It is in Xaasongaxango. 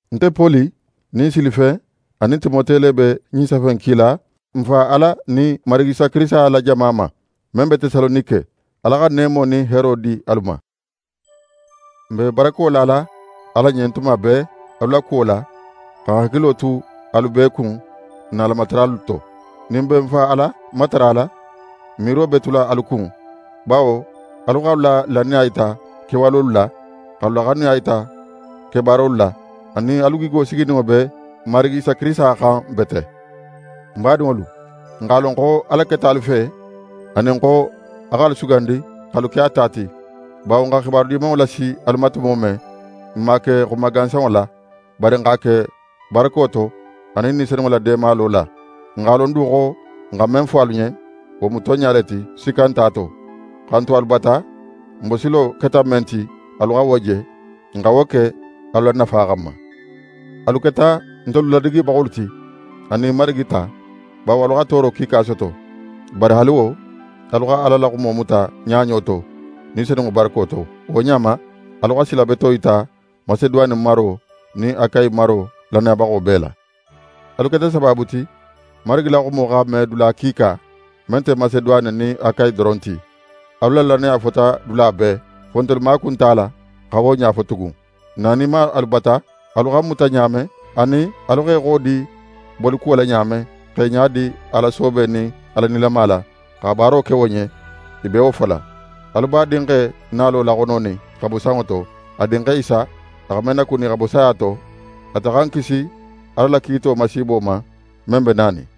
Nte Poli nin Silifen anin Timote le be ɲin safe in kila n Fa Ala nin Marigi Isa Kirisita la jama ma, men be Tesalonike. Ala xa neemo nin heero di alu ma. N be barako lala Ala ɲen tuma bee alu la kuwo la, xa n hakilo tu alu bee kun n na Alamataralu to. Nin n be n Fa Ala matarala, n miiro be tula alu kun, bawo alu x'alu la lannaya yita kewalolu la, x'alu la xanuya yita kebaarolu la, anin alu gigo sigininŋo be N Marigi Isa Kirisita xan bete. N badinŋolu, n x'a lon xo Ala keta alu fe, anin xo a x'alu sugandi x'alu ke a ta ti, bawo n xa xibaru Dimanŋo lasi alu ma tumo men, n man a ke xuma gansanŋo la; bari n x'a ke barako to anin Ni Senunŋo la deemalo la. N x'a lon du xo n xa men fo alu ɲen, wo mu tonɲa le ti, sikka nte a to. Xa n tu alu bata, n bosilo keta men ti, alu xa wo je. N xa wo ke alu la nafa xanma. Alu keta ntelu ladigibaxolu ti, anin Marigi ta, bawo alu xa tooro kiika soto. Bari haali wo, alu xa Ala la xumo muta ɲaɲo to, Ni Senunŋo barako to. Wo ɲa ma, alu xa sila beto yita Maseduwane maro nin Akayi maro lannayabaxo bee la. Atelu keta sabaabu ti, Marigi la xumo xa me dula kiika, men nte Maseduwane nin Akayi doron ti. Alu la lannaya fota dula bee, fo ntelu maaku nte a la xa wo ɲa fo tugun. N naninma alu bata, alu xa n muta ɲa men, anin alu xa i xodi bolikuwo la ɲa men, x'e ɲadi Ala soobe nin Ala nilama la, xa baaro ke wo ɲen, i be wo fola. Alu b'a Dinxe nalo laxononin xa bo sanŋo to, a Dinxe Isa, a xa men nakuni xa bo saya to. Ate xa n kisi Ala la kiito masiibo ma, men be nanin.